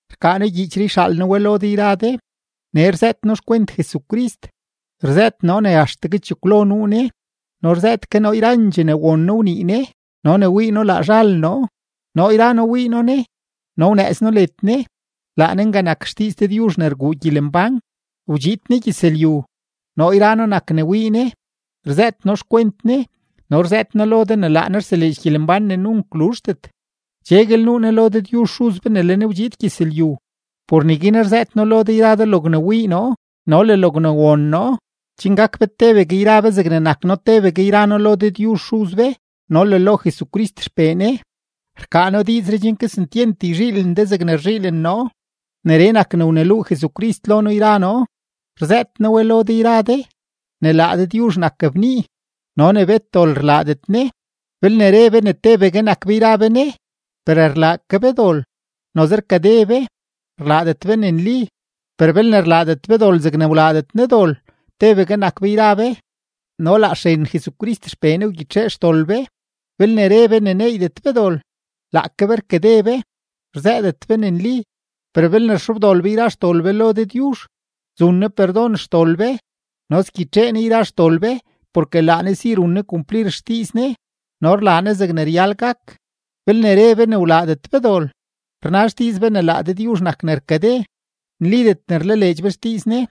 Rkaa noo gyiichree yxaal noo we lo de yra de. Nee rzëët noo xkwent Jesucrist. Rzëët noo ne axtegue chekwlo nuu Ne no rzëët ke noo yrandxee ne won noo wnii Ne no ne wii noo laa zhal noo; noo yra noo wii noo Ne no wnëëz noo led Ne. Laa Ne nga nak XDiiz Dëdyuzh ne rguu gyelembán. Wdxiid Ne gyëzlyu. Noo yra noo nak ne wii Ne, rzëët noo xkwent Ne, no rzëët noo lo de ne laa Ne rseleedx gyelembán ne nunk luzhdet. Cheguel nuu Ne lo Dëdyuzh Xuz be ne le Ne wdxiid gyëzlyu. Por neguin rzëët noo lo de yra de logne wii noo no le logne won noo, chen gak be tebegue yra be zegne nak noo tebegue yra noo lo Dëdyuzh Xuz be no le lo Jesucrist XPee Ne. Rkaa noo diizree chen kesentyent yzhiilen de zegne rzhiilen noo. Neree nak ne wneluu Jesucrist lo noo yra noo, rzëët noo we lo de yra de: ne laa Dëdyuzh nak bnii no ne bet dol rlaadet Ne. Belne re be ne tebegue nak be yra be Ne, per rlaa ke be dol, noze rkade be; rlaadet be ne nli. Per belne rlaadet be dol zegne rlaadet Ne dol, tebegue nak be yra be, no laa xren Jesucrist XPee Ne wgyitxee xdol be. Belne re be ne neeydet be dol, laake be rkade be, rzëëdet be ne nli. Per belne rxobdol be yra xdol be lo Dëdyuzh, zun Ne perdon xdol be no sgyitxee Ne yra xdol be porke laa Ne si run Ne kumplir xdiiz Ne no rlaa Ne zegne ryal gak. Belne re be ne wlaadet be dol, rna xdiiz be ne laa Dëdyuzh nak ne rkade; nlidet ne rlaleedx be xdiiz Ne.